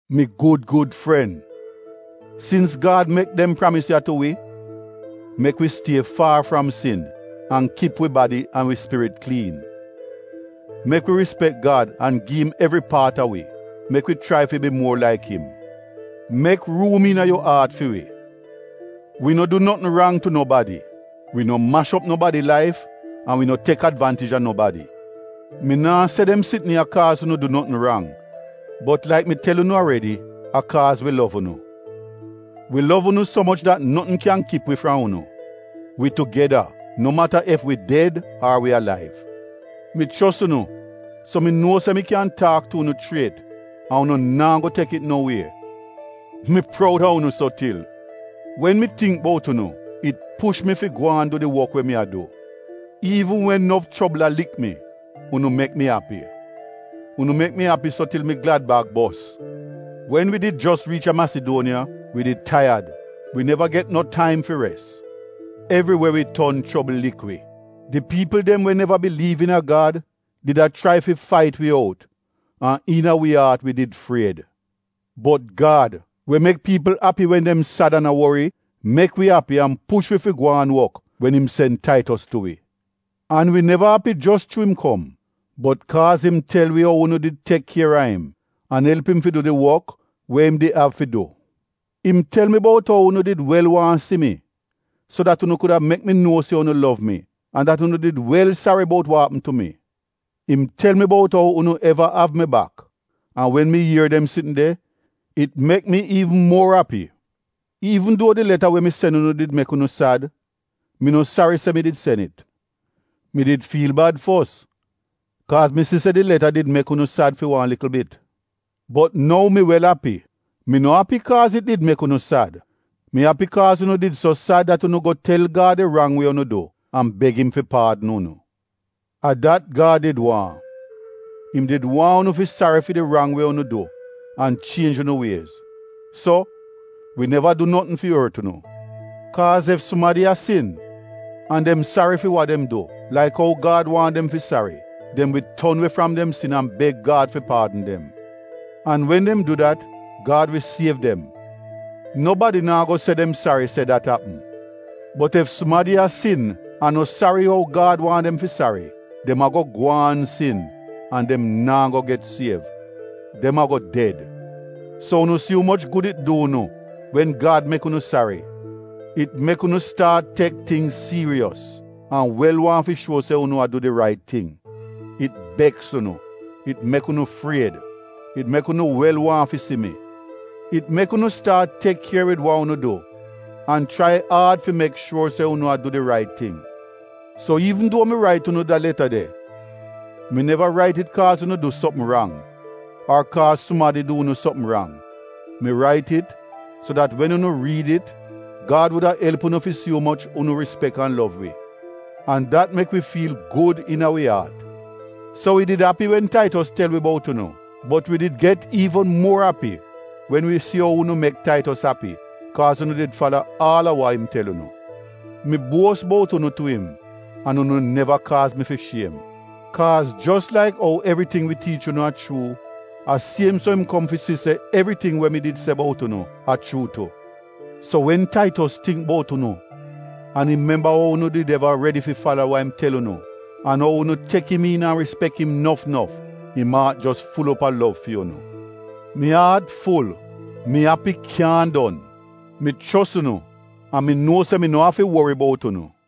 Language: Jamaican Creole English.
Mi gud gud fren, sins Gad mek dem pramis ya tu wi, mek wi stie faar fram sin an kip wi badi an wi spirit kliin. Mek wi rispek Gad an gi im evri paat a wi. Mek wi chrai fi bi muor laik im. Mek ruum iina yu aat fi wi. Wi no du notn rang tu nobadi, wi no mash op nobadi laif an wi no tek advaantij a nobadi. Mi naa se dem sitn ya kaaz unu du notn rang bot laik mi tel unu aredi, a kaaz wi lov unu. Wi lov unu so moch dat notn kyan kip wi fram unu. Wi tugeda no mata ef wi ded ar wi alaiv. Mi chos unu so mi nuo se mi kyan taak tu unu chriet an unu naa go tek it no wie. Mi proud a unu so til. Wen mi tingk bout unu, it push mi fi gwaan du di wok we mi a du. Iivn wen nof chobl a lik mi, unu mek mi api. Unu mek mi api so til mi glad-bag bos. Wen wi did jos riich a Masiduoniya, wi did taiyad, wi neva get no taim fi res. Evriwe wi ton chobl lik wi. Di piipl dem we neva biliiv iina Gad did a chrai fi fait wi out an iina wi aat wi did fried. Bot Gad we mek piipl api wen dem sad an a wori, mek wi api an push wi fi gwaan wok wen im sen Taitos tu wi. An wi neva api jos chuu im kom, bot kaaz im tel wi ou unu did tek kier a im an elp im fi du di wok we im did av fi du. Im tel wi bout ou unu did wel waahn si mi so dat unu kuda mek mi nuo se unu lov mi, an dat unu did wel sari bout wa apm tu mi. Im tel mi bout ou unu eva av mi bak. An wen mi ier dem sitn de, it mek mi iivn muor api. Iivn duo di leta we mi sen unu did mek unu sad, mi no sari se mi did sen it. (Mi did fiil bad fos kaaz mi si se di leta did mek unu sad fi wan likl bit). Bot nou mi wel api. Mi no api kaaz it did mek unu sad. Mi api kaaz unu did so sad dat unu go tel Gad di rang we unu du an beg im fi paadn unu. A dat Gad did waahn. Im did waahn unu fi sari fi di rang we unu du an chienj unu wiez. So, wi neva du notn fi ort unu. Kaaz ef sumadi a sin, an dem sari fi wa dem du laik ou Gad waahn dem fi sari, dem wi ton we fram dem sin an beg Gad fi paadn dem. An wen dem du dat Gad wi siev dem. Nobadi naa go se dem sari se dat apm. Bot ef sumadi a sin an no sari ou Gad waahn dem fi sari, dem a-go gwaan sin an dem naa go get siev. Dem a-go ded. So unu si umoch gud it du unu wen Gad mek unu sari. It mek unu staat tek tingz siiros an wel waahn fi shuo se unu a du di rait ting. It beks unu. It mek unu fried. It mek unu wel waahn fi si mi. It mek unu staat tek kier wid wa unu du an chrai aad fi mek shuor se unu a du di rait ting. So iivn duo mi rait unu da leta de, mi neva rait it kaaz unu du sopm rang ar kaaz sumadi du unu sopm rang. Mi rait it, so dat wen unu riid it Gad wuda elp unu fi si umoch unu rispek an lov wi. An dat mek wi fiil gud iina wi aat. So wi did api wen Taitos tel wi bout unu, bot wi did get iivn muor api wen wi si ou unu mek Taitos api kaaz unu did fala aal a wa im tel unu. Mi buos bout unu tu im an unu neva kaaz mi fi shiem. Kaaz jos laik ou evriting wi tiich unu a chuu, a siem so im kom fi si se evriting we mi did se bout unu a chuu tu. So wen Taitos tingk bout unu an im memba ou unu did eva redi fi fala wa im tel unu, an ou unu tek im iin an rispek im nof nof, im aat jos ful op a lov fi unu. Mi aat ful. Mi api kyaahn don. Mi chos unu an mi nuo se mi no afi wori bout unu.